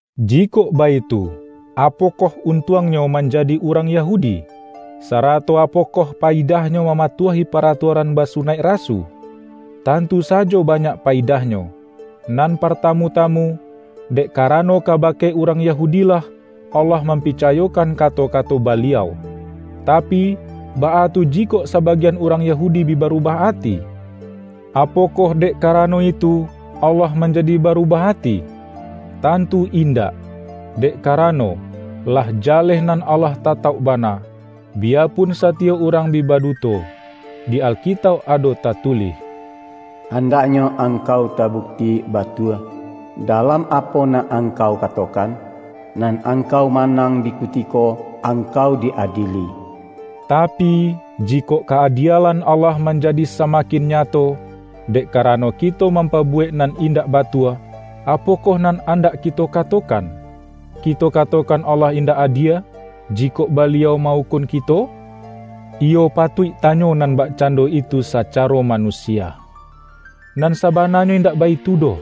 Jikok baitu, apokoh untuangnyo manjadi urang Yahudi? Sarato apokoh payidahnyo mamatuahi paratuaran basunaik rasu? Tantu sajo banyak payidahnyo! Nan partamu-tamu, dek karano kabake urang Yahudi-lah, Allah mampicayokan kato-kato Baliau. Tapi, baa tu jikok sabagian urang Yahudi bi barubah ati? Apokoh dek karano itu, Allah manjadi barubah ati? Tantu indak! Dek karano, lah jaleh nan Allah tatauk bana, biyapun satiyok urang bi baduto. Di Alkitauk ado tatulih,”Andaknyo angkau tabukti batua, dalam apo nan angkau katokan, nan angkau manang di kutiko angkau di-adieli.” Tapi, jikok ka-adielan Allah manjadi samakin nyato, dek karano kito mampabuwek nan indak batua, apokoh nan andak kito katokan? Kito katokan Allah indak adie, jikok Baliau ma-ukun kito? (Iyo patuik tanyo nan bakcando itu sacaro manusia.) Nan sabananyo indak baitu doh!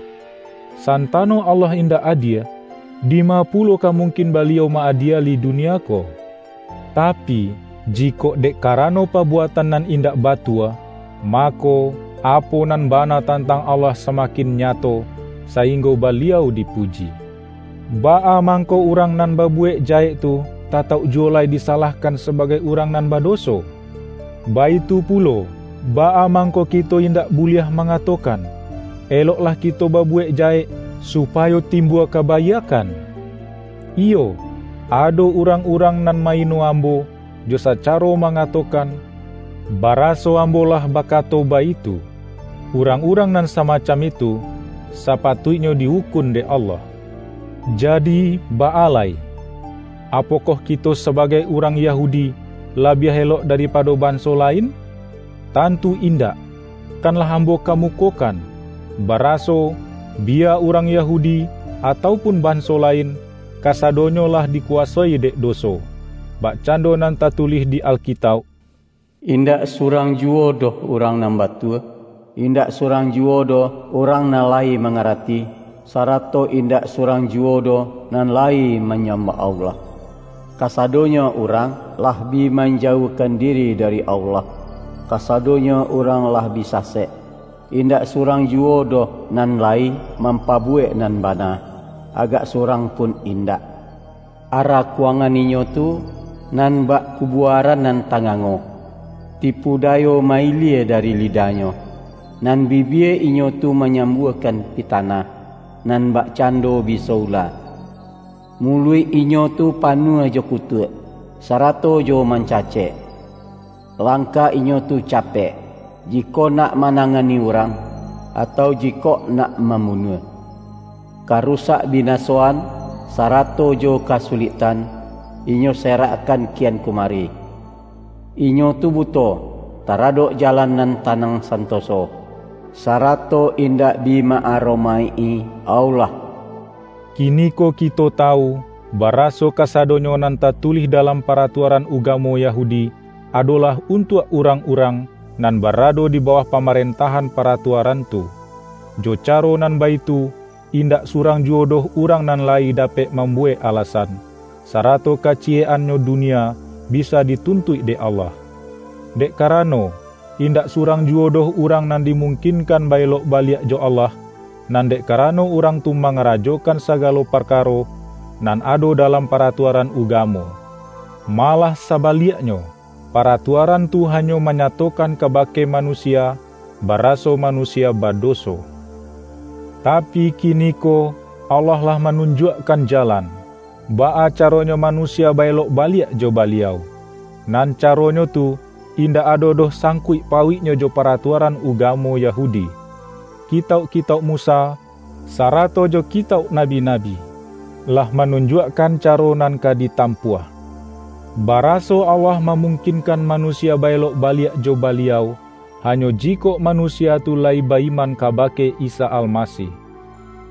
Santano Allah indak adie, dima pulo ka mungkin Baliau ma-adieli dunia ko? Tapi, jikok dek karano pabuatan nan indak batua, mako, apo nan bana tantang Allah samakin nyato, sainggo Baliau dipuji. Baa mangko urang nan babuwek jahek tu, tatauk juwo lai disalahkan sabagai urang nan badoso? Baitu pulo, baa mangko kito indak buliah mangatokan,”Eloklah kito babuwek jahek, supayo timbua kabaiakkan?" Iyo, ado urang-urang nan ma-ino ambo, jo sacaro mangatokan, baraso ambo lah bakato baitu. Urang-urang nan samacam itu, sapatuiknyo di-ukun dek Allah. Jadi, baa lai? Apokoh kito sabagai urang Yahudi, labiah elok daripado banso lain? Tantu indak! Kan lah ambo kamukokan, baraso, biya urang Yahudi atau pun banso lain, kasadonyo lah dikuwasoi dek doso. Bakcando nan tatulih di Alkitauk,”Indak surang juwo doh urang nan batua, indak surang juwo doh urang nan lai mangarati, sarato indak surang juwo doh nan lai manyambah Allah. Kasadonyo urang lah bi manjauahkan diri dari Allah; kasadonyo urang lah bi sasek. Indak surang juwo doh nan layi mampabuwek nan bana; agak surang pun indak! Arakuangan inyo tu, nan bak kubuaran nan tangango. Tipu dayo ma-ilie dari lidahnyo, nan bibie inyo tu manyambuakan pitanah, nan bakcando biso ula. Muluik inyo tu panuah jo kutuak, sarato jo mancacek. Langkah inyo tu capek, jikok nak manangani urang, atau jikok nak mambunuah. Karusak-binasoan, sarato jo kasuliktan, inyo serakkan kian kumari. Inyo tu buto, taradok jalan nan tanang santoso, sarato indak bi ma-aromaik-i Allah.” Kiniko kito tawu, baraso kasadonyo nan tatulih dalam paratuaran ugamo Yahudi, adolah untuak urang-urang, nan barado di bawah pamarentahan paratuaran tu. Jo caro nan baitu, indak surang juwo doh urang nan lai dapek mambuwek alasan, sarato kaciyek-annyo dunia bisa dituntuik dek Allah. Dek karano, indak surang juwo doh urang nan dimungkinkan ba-elok baliak jo Allah, nan dek karano urang tu mangarajokan sagalo parkaro, nan ado dalam paratuaran ugamo. Malah sabaliaknyo, paratuaran tu hanyo manyatokan kabake manusia, baraso manusia badoso. Tapi kiniko, Allah lah manun-juakkan jalan, baa caronyo manusia ba-elok baliak jo Baliau; nan caronyo tu, indak ado doh sangkuik pauiknyo jo paratuaran ugamo Yahudi. Kitauk-kitauk Musa, sarato jo kitauk nabi-nabi, lah manunjuakkan caro nan ka ditampuah, baraso Allah mamungkinkan manusia ba-elok baliak jo Baliau, hanyo jikok manusia tu layi ba-iman kabake Isa Almasih.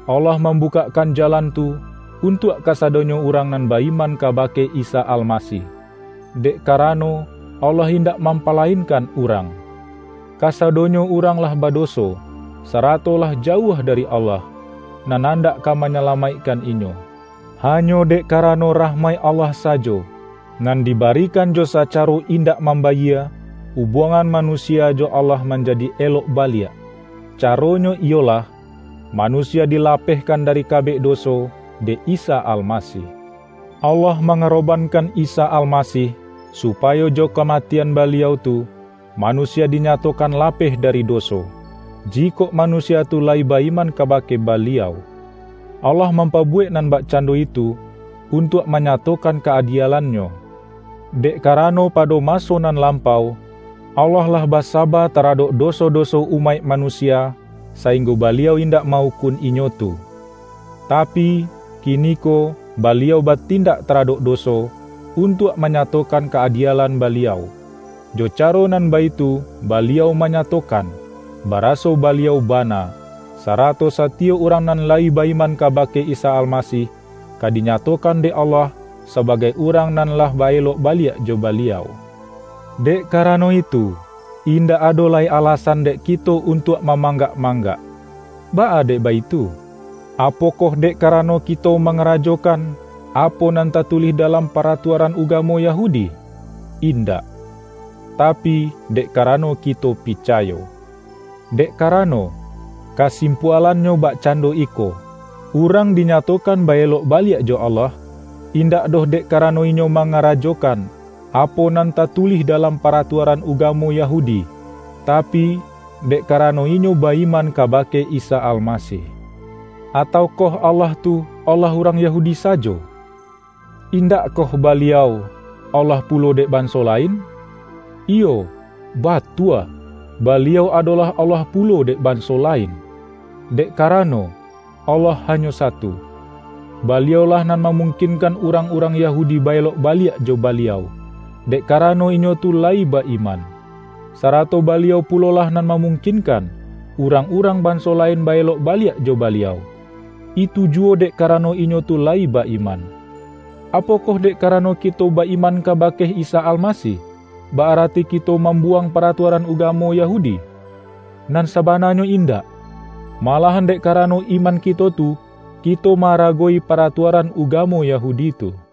Allah mambukakkan jalan tu, untuak kasadonyo urang nan ba-iman kabake Isa Almasih; dek karano Allah indak mampalainkan urang: Kasadonyo urang lah badoso, sarato lah jauah dari Allah, nan andak ka manyalamaikkan inyo. Hanyo dek karano rahmaik Allah sajo, nan dibarikan jo sacaro indak mambayie, ubuangan manusia jo Allah manjadi elok baliak; caronyo iyolah: manusia dilapehkan dari kabek doso dek Isa Almasih. Allah mangarobankan Isa Almasih, supayo jo kamatian Baliau tu, manusia dinyatokan lapeh dari doso, jikok manusia tu layi ba-iman kabake Baliau. Allah mampabuwek nan bakcando itu, untuak manyatokan ka-adielan-Nyo. Dek karano pado maso nan lampau, Allah lah basaba taradok doso-doso umaik manusia, sainggo Baliau indak ma-ukun inyo tu. Tapi, kiniko Baliau batindak taradok doso, untuak manyatokan ka-adielan Baliau. Jo caro nan baitu Baliau manyatokan, baraso Baliau bana; sarato satiyok urang nan layi ba-iman kabake Isa Almasih, ka dinyatokan dek Allah, sabagai urang nan lah ba-elok baliak jo Baliau. Dek karano itu, indak ado lai alasan dek kito untuak mamanggak-manggak. Baa dek baitu? Apokoh dek karano kito mangarajokan, apo nan tatulih dalam paratuaran ugamo Yahudi? Indak. Tapi, dek karano kito picayo. Dek karano, kasimpualannyo bakcando iko: Urang dinyatokan ba-elok baliak jo Allah, indak doh dek karano inyo mangarajokan, apo nan tatulih dalam paratuaran ugamo Yahudi, tapi, dek karano inyo ba-iman kabake Isa Almasih. Ataukoh Allah tu, Allah urang Yahudi sajo? Indakkoh Baliau, Allah pulo dek banso lain? Iyo, batua, Baliau adolah Allah pulo dek banso lain! Dek karano, Allah hanyo satu. Baliau-lah nan mamungkinkan urang-urang Yahudi ba-elok baliak jo Baliau, dek karano inyo tu layi ba-iman. Sarato Baliau pulolah nan mamungkinkan, urang-urang banso lain ba-elok baliak jo Baliau; itu juwo dek karano inyo tu layi ba-iman. Apokoh dek karano kito ba-iman kabake Isa Almasih, ba-arati kito mambuwang paratuaran ugamo Yahudi? Nan sabananyo indak! Malahan dek karano iman kito tu, kito ma-aragowi paratuaran ugamo Yahudi tu. ROMA